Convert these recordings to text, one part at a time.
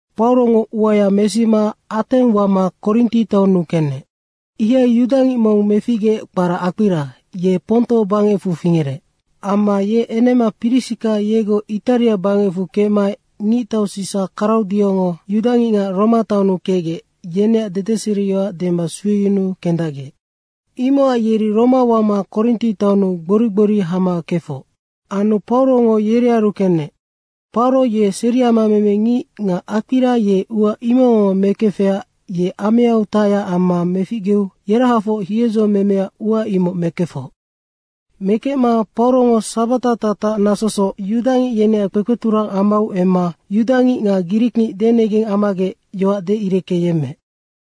Paurongo uaya mesima Ateng wama Korinti taonnu kenec. Ihai yudangic mong meficgeec kpara Akpira, ye Ponto bangecfu fingerec. Amma ye enema Prisika yegoc Itaria bangecfu kecmaec ngictau Sisa Kraudiongo yudangicngac Roma taonnu kecgec, yeneac dedeseriyoac dema sueyunuu kendacgec. Imocac yeri Roma wama Korinti taonnu gbori gbori hama kefoc. Anu Paurongo yerearu kenec. Pauro ye seriama memengic nga Akpira ye ua imocngoc mekefecac ye ameau tacyac amma meficgeu yerahafoc hiedzo memeac ua imoc mekefoc. Mekecma Paurongo sabata tatac nasosoc yudangic yeneac kpekpeturang amau emma yudangic nga grikngic denegeng ammagec yoac deireckeyemmeec.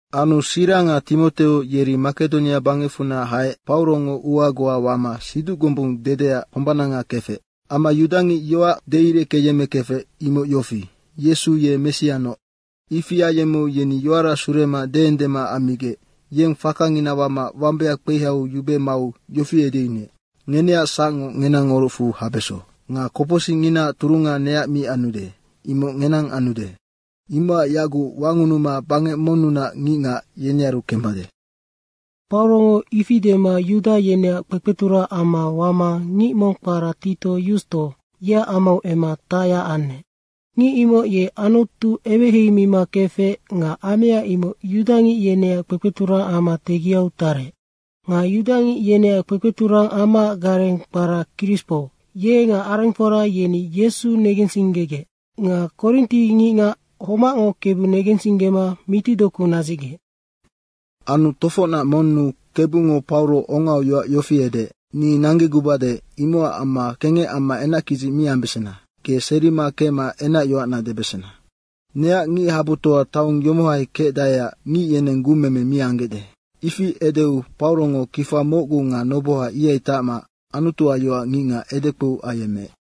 Anu Sira nga Timoteo yeri Makedonia bangecfunac haec Paurongo ua goa wama siduc gombung dedeac hombananga kefec. Amma yudangic yoac deireckeyemmekefec, imoc yofi, “Yesu ye Messianoc.” Ifi ayemmeu yeni yoara surema deendema ammigec yeng fakangina wama wambaya kpeihaiu yube mau yofi edeyunuec, “Ngeneac sacngo ngenang orucfu habeso. Nga kopocsicnginaac turunga neac mi anude, imoc ngenang anude. Imocac yaguc wangunuma bangec monnunac ngicngac, yenearu kembade.” Paurongo ifi dema yuda yeneac kpekpeturang ama wama ngic mong kpara Titio Yusto, yeac amau emma tacyac anec. Ngic imoc ye Anutu eweheimima kefec nga amea imoc yudangic yeneac kpekpeturang ama tegiau tarec. Nga yudangic yeneac kpekpeturang amaac gareng kpara Krispo, ye nga arengfora yeni Yesu negensinggegec. Nga Korinti ngicngac homacngo Kebu negensinggema mitidoku nadzicgec. Anu Tofocnac monnu Kebungo Pauro ongau yoac yofi edeec, “Ni nanggegubade, imocac amma kengec amma enackidzic mi ambesena, ge serima kecma enacyoacna debesena. Neac ngichabutoa taong yomohai kecdaeac ngic yeneng gumeme mi anggecde.” Ifi edeu Paurongo kifa mocgu nga noboha ihai tacma Anutuac yoac ngicngac edekpou ayemmeec.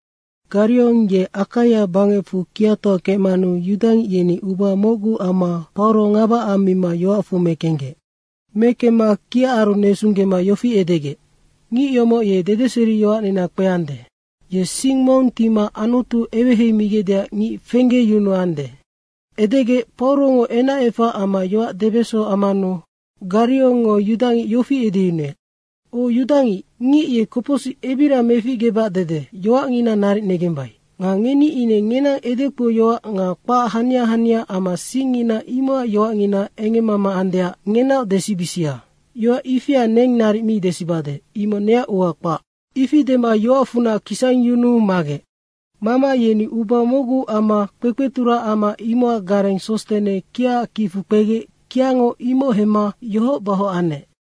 Gariong ye Akaia bangecfu kiatoa kecmanu yudangic yeni uba mocgu amma Pauro ngaba ammima yoacfu mekenggec. Mekemma kiaaru nesunggema yofi edegec, “Ngic yomoc ye dedeseriyoacnina kpeande. Ye sing mong tima Anutu eweheimigecdeac ngic fenggeyunuande.” Edegec Paurongo enacefac amma yoac debeso ammanu Gariongngo yudangic yofi edeyunuec, “O yudangic, ngic ye kopocsic ebiria meficgebac dede yoacngina naric negembai. Nga ngeni ine ngenang edekpouyoac nga kpac hania hania amma singngina imocac yoacngina engemmama andeac ngenaoc desibisia. Yoac ifia neng naric mi desibade, imoc neac ua kpahac.” Ifi dema yoacfunac kisangyunuu magec. Mama yeni uba mocgu amma kpekpeturang ama imocac gareng Sostene kiaac kicfu kpegec kiango imoc hemma yohoc bahoc anec.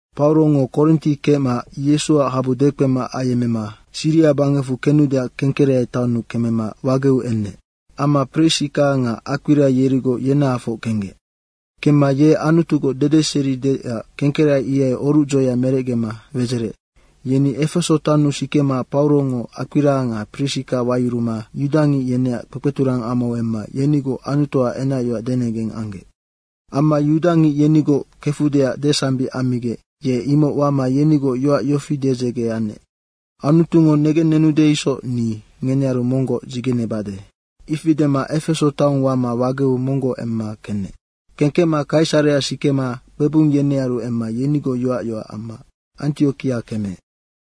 Paurongo Korinti kecma Yesuac habu dekpemac ayemmema Siria bangecfu kenudeac Kengkereai taonnu kemema wageu enec. Amma Prisika nga Akpira yerigoc yenahafoc kenggec. Kemma ye Anutugoc dedeseri deecac Kengkereai ihai orucdzoea merecgema wedzerec. Yeni Efeso taonnu sikema Paurongo Akpira nga Prisika wayuruma yudangic yeneac kpekpeturang amau emma yenigoc Anutuac enacyoac denegeng anggec. Amma yudangic yenigoc kefudeac desambic ammigec ye imoc wama yenigoc yoac yofi dedzege anec. “Anutungo negennenude isoc ni ngenearu monggoc dzigenebade.” ifi dema Efeso taong wama wageu monggoc emma kenec. Kengkecma Kaisarea sikema kpebung yenearu emma yenigoc yoac yoac amma Antiokia kemeec.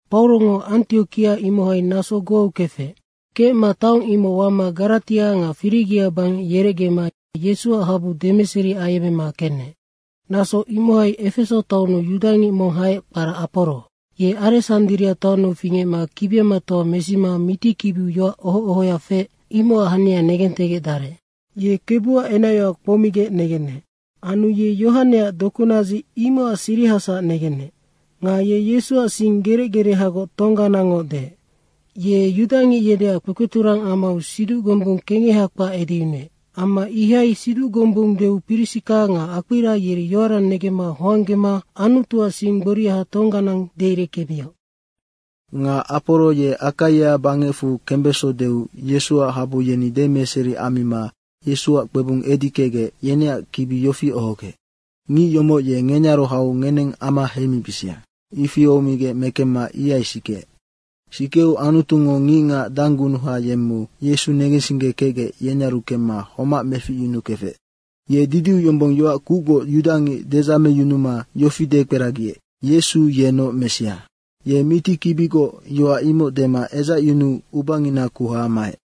Paurongo Antiokia imohai naso goau kefec. Kecma taong imoc wama Garatia nga Firigia bangec yerecgema Yesuac habu demeseri ayemmema kenec. Naso imohai Efeso taonnu yudangic mong haec, kpara Aporo. Ye Aresandria taonnu fingecma kibiamatoa mesima mitikibiu yoac oho ohoya feec, imocac hania negentegecdarec. Ye Kebuac enacyoac kpoumigec negenec. Anu ye Yohaneac dokunadzic, imocac sirihasac negenec. Nga ye Yesuac sing gerec gerehagoc tongganangngoc deec. Ye yudangic yeneac kpekpeturang amau siduc gombung kengeha kpac edeyunuec. Amma ihai siduc gombung deu Prisika nga Akpira yeri yoara negemma hoanggema Anutuac sing gboria tongganang deireckemioc. Nga Aporo ye Akaia bangecfu kembeso deu Yesuac habu yeni demeseri ammima Yesuac kpebung edi kecgec, yeneac kibi yofi ohogec, “Ngic yomoc ye ngenearu hau ngeneng ama heimibisia.” ifi ohomigec mekengkecma ihai sikeec. Sikeu Anutungo ngicngac danggunuha yemmeu Yesu negensinggekecgec, yenearu kemma homac meficyunukefec. Ye didiu yombong yoac kucgoc yudangic dedzameyunuma yofi dekperagiec, “Yesu yennoc Messia.” Ye mitikibigoc yoac imoc dema edzacyunuu ubangina kuha maec.